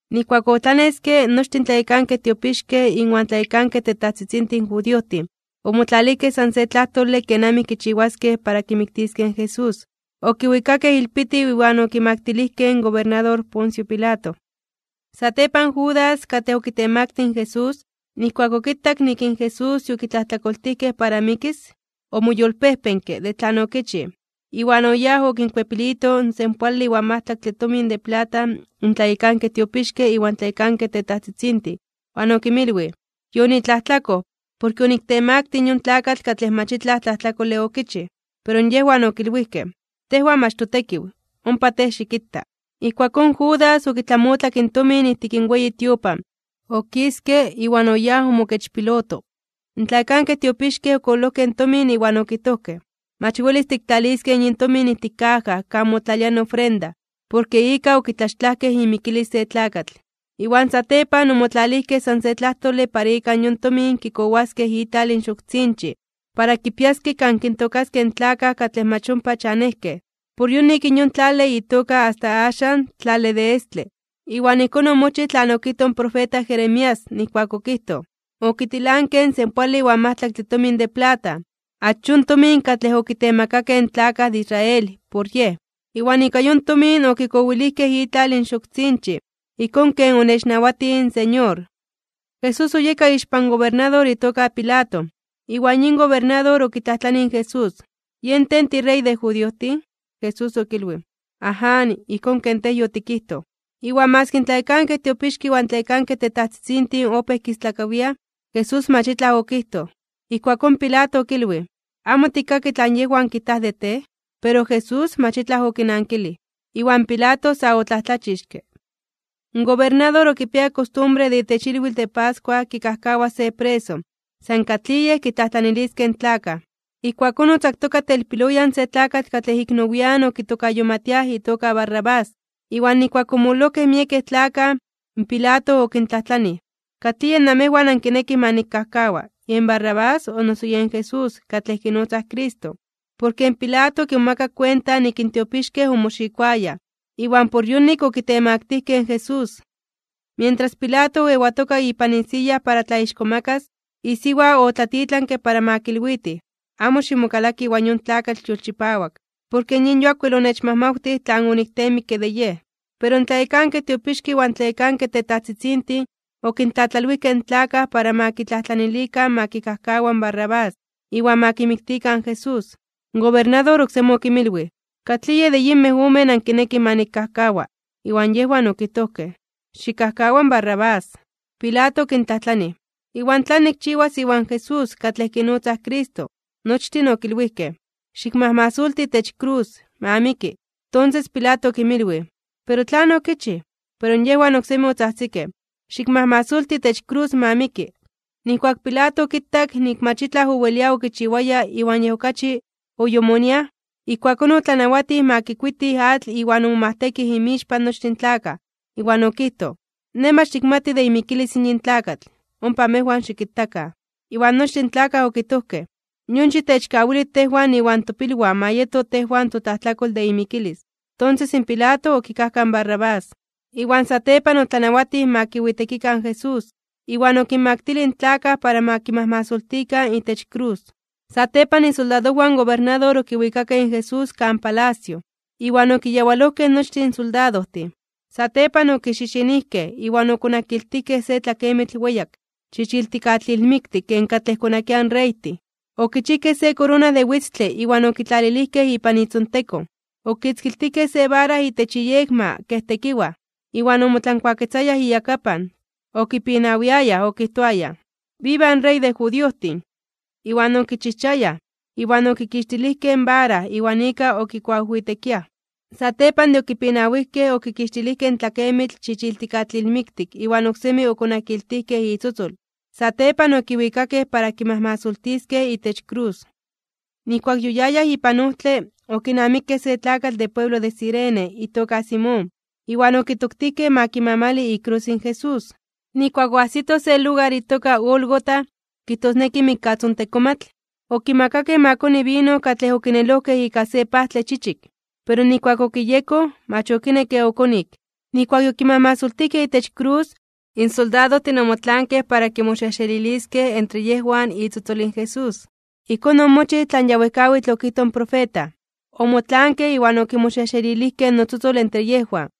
Nijkuak otlaneske, nochtin in tlayekankej tiopixkej inwan tlayekankej tetajtzitzintin judiojtin, omotlalijkej san se tlajtole kenamij kichiwaskej para kimiktiskej in Jesús. Okiwikakej ilpitiw iwan okimaktilijkej in gobernador Poncio Pilato. Satepan Judas, katlej okitemaktij (okitemaktilij) in Jesús, nijkuak okitak nik in Jesús yokitlajtlakoltijkej para mikis, omoyolpejpenke (omoyolkuepke) de tlan okichij, iwan oyáj okinkuepilito in senpoale iwan majtlaktle tomin de plata in tlayekankej tiopixkej iwan tlayekankej tetajtzitzintin. Iwan okinmilwij: ―Yonitlajtlakoj, porke oniktemaktij yon tlakatl katlej mach itlaj tlajtlakole okichij. Pero yejwan okilwijkej: ―Tejwan mach totekiw. ¡Ompa tej xikita! Ijkuakón Judas okitlamotlak in tomin ijtik in weyi tiopan, okiske, iwan oyáj omokechpiloto. In tlayekankej tiopixkej okololojkej in tomin iwan okijtojkej: ―Mach welis tiktlaliskej yin tomin ijtik kaja kan motlalia in ofrenda, porke ika okitlaxtlajkej imikilis se tlakatl. Iwan satepan omotlalijkej san se tlajtole para ika yon tomin kikowiliskej itlal in Xoktzinchij, para kipiaskej kan kintookaskej in tlakaj katlej mach ompa chanejkej. Por yonik yon tlale itoka asta axan, Tlale de Estle. Iwan ijkón omochij tlan okijtoj in profeta Jeremías, nijkuak okijtoj: “Okitilankej (okonankej) in senpoale iwan majtlaktle tomin de plata, achón tomin katlej okitemakakej in tlakaj de Israel por Yej. Iwan ika yon tomin okikowilijkej itlal in Xoktzinchij, ijkón ken onechnawatij in Señor.” Jesús oyeka ixpan gobernador itoka Pilato, iwan yin gobernador okitlajtlanij in Jesús: ―¿Yen tej tiRey de judiojtin? Jesús okilwij: ―Aján, ijkón ken tej yotikijtoj. Iwan maski in tlayekankej tiopixkej iwan tlayekankej tetajtzitzintin opéj kistlakawiaj, in Jesús mach itlaj okijtoj. Ijkuakón Pilato okilwij: ―¿Amo tikkaki tlan yejwan kijtaj de tej? Pero Jesús mach itlaj okinankilij. Iwan Pilato sa otlajtlachixke (omomajmawtij). In gobernador okipiaya kostumbre ke itech ilwitl de pascua kikajkawas se preso, san katlij yej kitlajtlaniliskej in tlakaj. Ijkuakón otzaktoka telpiloyan se tlakatl katlej ik nowian (nian nepa) okitokayomatiaj itoka Barrabás. Iwan nijkuak omololojkej miekej tlakaj, in Pilato okintlajtlanij: ―¿Katlij yej namejwan nankinekij ma nikkajkawa: yen Barrabás, o noso yen Jesús, katlej kinotzaj Cristo? Porke in Pilato okimomakak kuenta nik in tiopixkej omoxikoayaj, iwan por yonik okitemaktijkej (okitemaktilijkej) in Jesús. Mientras Pilato oewatoka ipan isiya para tlaixkomakas (tlatzonmanas), isiwa otlatitlanke ma kilwitij: “Amo ximokalaki iwan yon tlakatl yolchipawak, porke yin yuak wel onechmajmawtij tlan onikteemikke de yej.” Pero in tlayekankej tiopixkej iwan tlayekankej tetajtzitzintin okintlatlalwijkej in tlakaj para ma kitlajtlanilikan ma kikajkawakan in Barrabás, iwan ma kimiktikan in Jesús. In gobernador oksemi okinmilwij: ―¿Katlij yej de yinmej omen ankinekij ma nikkajkawa? Iwan yejwan okijtojkej: ―Xikkajkawa in Barrabás. Pilato okintlajtlanij: ―¿Iwan tlan nikchiwas iwan Jesús, katlej kinotzaj Cristo? Nochtin okilwijkej: ―¡Xikmajmasolti itech krus! ¡Ma miki! Tonses in Pilato okinmilwij: ―Pero, ¿tlan okichij? Pero yejwan oksemi otzajtzikej: ―¡Xikmajmasolti itech krus! ¡ma miki! Nijkuak in Pilato okitak nik mach itlaj owelia okichiwaya iwan yej okachi oyomoniaj, ijkuakón otlanawatij ma kikuitij atl iwan omomajtekij inmixpan nochtin tlakaj, iwan okijtoj: ―Nej mach nikmati de imikilis in yin tlakatl. Ompa amejwan xikitakan. Iwan nochtin in tlakaj okijtojkej: ―¡Yon xitechkawili tejwan iwan topilwan ma yeto tejwan totlajtlakol de imikilis! Tonses in Pilato okikajkaj in Barrabás. Iwan satepan otlanawatij ma kiwitekikan in Jesús, iwan okinmaktilij in tlakaj para ma kimajmasoltikan itech krus. Satepan isoldadojwan in gobernador okiwikakej in Jesús kan palacio, iwan okiyawalojkej nochtin in soldadojtin. Satepan okixixinijkej (okixipetzojkej), iwan okonakiltijkej se tlakemitl weyak chichiltikatlilmiktik ken katlej konakiaj in reytin. Okichijkej se korona de witztle iwan okitlalilijkej ipan itzontekon. Okitzkiltijkej se vara itech iyekma kej tekiwaj. Iwan omotlankuaketzayaj iyakapan, okipinawiayaj okijtoayaj: ―¡Viva in Rey de judiojtin! Iwan okichijchayaj, iwan okikixtilijkej in vara iwan ika okikuawijwitekiaj. Satepan de okipinawijkej, okikixtilijkej in tlakemitl chichiltikatlilmiktik iwan oksemi okonakiltijkej itzotzol. Satepan okiwikakej para kimajmasoltiskej itech krus. Nijkuak yoyayaj ipan ojtle, okinamikej se tlakatl de pueblo de Cirene itoka Simón. Iwan okitoktijkej ma kimamali ikrus in Jesús. Nijkuak oajsitoj se lugar itoka Gólgota, kijtosneki Mikkatzontekomatl, okimakakej ma koni vino katlej okinelojkej ika se pajtle chichik. Pero nijkuak okiyekoj, mach okinekke okonik. Nijkuak yokimajmasoltijkej itech krus, in soldadojtin omotlaankej para kimoxejxeliliskej entre yejwan itzotzol in Jesús. Ijkón omochij tlan ya wejkawitl okijtoj in profeta: “Omotlaankej, iwan okimoxejxelilijkej notzotzol entre yejwan.”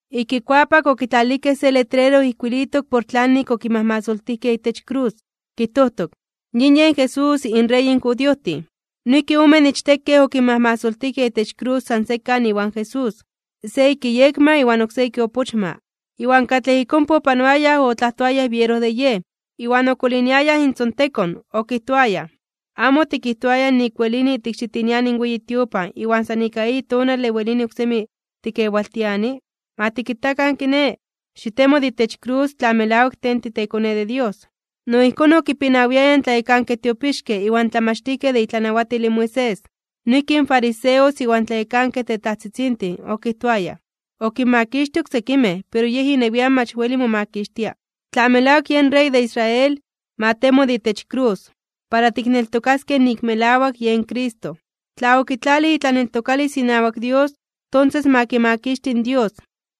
Ik ikuapak okitlalilijkej se letrero ijkuilitok por tlanik okimajmasoltijkej itech krus. Kijtojtok: “Yin yen Jesús, inRey in judiojtin.” Noijki omen ichtekej okinmajmasoltijkej itech krus san sekan iwan Jesús, se ik iyekma iwan oksé ik iopochma. Iwan katlej ik ompa opanoayaj otlajtoayaj biero de Yej, iwan okoliniayaj intzontekon okijtoayaj: ―¿Amo otikijtoaya nik welini tikxitiniani in weyi tiopan iwan san ika eyi tonale welini oksemi tikewaltiani? Ma tikitakan kiné. Xitemo de itech krus tla melawak tej titeKone de Dios. No ijkón okipinawiayaj in tlayekankej tiopixkej iwan tlamachtijkej de itlanawatil in Moisés, noijki in fariseos iwan tlayekankej tetajtzitzintin, okijtoayaj: ―Okinmakixtij oksekimej, pero yej inewian mach weli momakixtia. Tla melawak yen Rey de Israel, ma temo de itech krus, para tikneltokaskej nik melawak yen Cristo. Tla okitlalij itlaneltokalis inawak Dios, tonses ma kimakixti in Dios,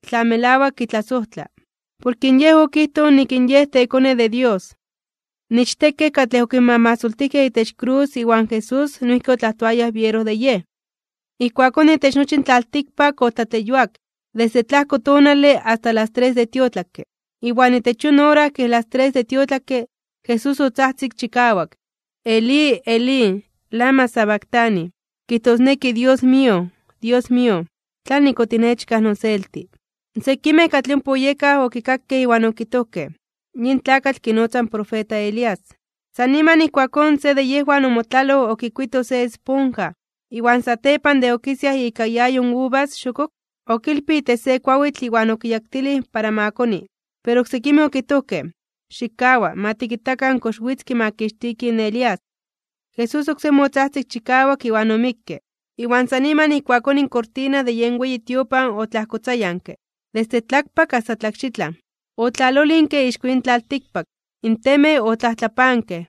tla melawak kitlasojtla. Porke Yej okijtoj nik in Yej teKone de Dios. In ichtekej katlej okinmajmasoltijkej itech krus iwan Jesús noijki otlajtoayaj biero de Yej. Ijkuakón itech nochi in tlaltikpak otlatleyuak, desde tlajko tonale asta las tres de tiotlakke. Iwan itech yon ora kej las tres de tiotlakke, Jesús otzajtzik chikawak: ―Elí, Elí, ¿lama sabactani? ―kijtosneki: Dios mío, Dios mío, ¿tlanik otinechkaj noselti? Sekimej katlej ompa oyekaj, okikakej iwan okijtojkej: ―Yin tlakatl kinotza in profeta Elías. San niman ijkuakón se de yejwan omotlaloj okikuito se esponja, iwan satepan de okisiaj ika iayo uvas xokok, okilpij itech se kuawitl iwan okiyaktilij para ma koni. Pero oksekimej okijtojkej: ―Xikkawa. Ma tikitakan kox witz kimakixtiki in Elías. Jesús oksemi otzajtzik chikawak, iwan omikke. Iwan san niman ijkuakón in kortina de yen weyi tiopan otlajkotzayanke, desde tlakpak asta tlakxitlan. Otlalolinke ixko yin tlaltikpak, in temej otlajtlapankej,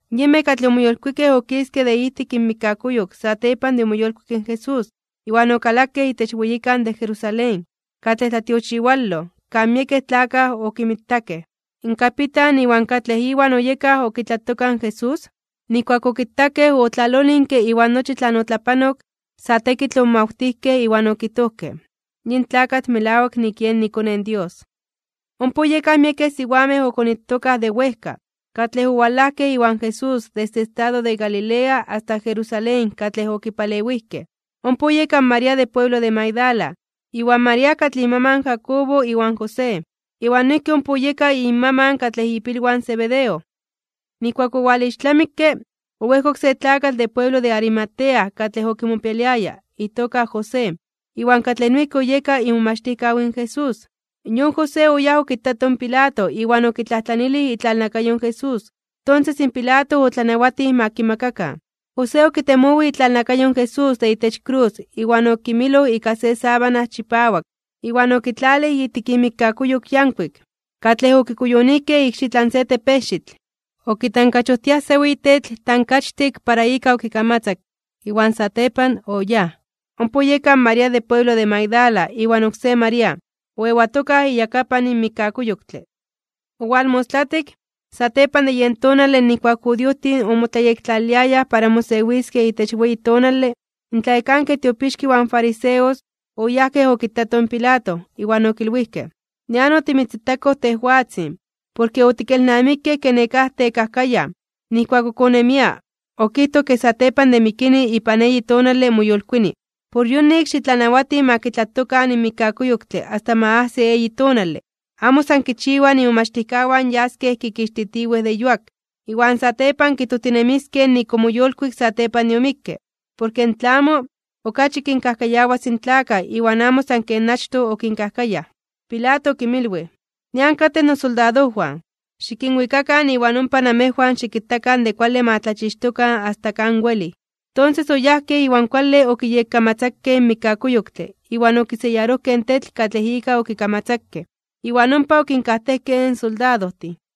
Yinmej katlej omoyolkuikej okiskej de ijtik inmikkakuyok satepan de omoyolkuik in Jesús, iwan okalakej itech weyikan de Jerusalén, katlej tlatiochiwaloj, kan miekej tlakaj okinmitakej. In kapitan iwan katlej iwan oyekaj okitlatokaj in Jesús, nijkuak okitakej otlalolinke iwan nochi tlan otlapanok, sa tekitl omomawtijkej iwan okijtojkej: ―Yin tlakatl melawak nik yen iKone in Dios. Ompa oyekaj miekej siwamej okonitokaj de wejka, katlej owalajkej iwan Jesús desde estado de Galilea asta Jerusalén katlej okipalewijkej. Ompa oyeka in María de pueblo de Magdala, iwan María katlej inmaman in Jacobo iwan José, iwan noijki ompa oyeka inmaman katlej ipilwan in Zebedeo. Nijkuak owalixtlamikke, oejkok se tlakatl de pueblo de Arimatea katlej okimopialiaya, itoka José, iwan katlej noijki oyeka imomachtijkaw in Jesús. Yon José oyáj okitato in Pilato iwan okitlajtlanilij itlalnakayo in Jesús. Tonses in Pilato otlanawatij ma kimakakan. José okitemowij itlalnakayo in Jesús de itech krus iwan okimiloj ika se sábana chipawak iwan okitlalij ijtik imikkakuyok yankuik, katlej okikuyonijkej ikxitlan se tepejxitl. Okitankachojtiaj se weyi tetl tankachtik para ika okikamatzakke, iwan satepan oyáj. Ompa oyeka in María de pueblo de Magdala iwan oksé María, oewatokaj iyakapan mikkakuyoktle. Owalmostlatik, satepan de yen tonale nijkuak in judiojtin omotlayektlaliliayaj para mosewiskej itech weyi tonale, in tlayekankej tiopixkej iwan fariseos, oyajkej okitatoj in Pilato iwan okilwijkej: ―Nian otimitzitakoj tejwatzin, porke otikelnamikej ke nekáj tekajkayaj, nijkuak ok onemia, okijtoj ke satepan de mikini ipan eyi tonale moyolkuini. Por yonik, xitlanawati ma kitlatokan in mikkakuyoktle asta ma ajsi eyi tonale, amo san kichiwa imomachtijkawan yaskej kikixtitiwej de yuak, iwan satepan kijtojtinemiskej nik omoyolkuik satepan de omikke. Porke in tlamo, okachi kinkajkayawas in tlakaj iwan amo san ken achtoj okinkajkayaj. Pilato okinmilwij: ―Nian katej nosoldadojwan. Xikinwikakan iwan ompa namejwan xikitakan de kuale ma tlachixtokan asta kan welij. Tonses oyajkej iwan kuale okiyekkamatzakej in mikkakuyoktle iwan okiseyarojkej in tetl katlej ika okikamatzakej, iwan ompa okinkajtejkej in soldadojtin.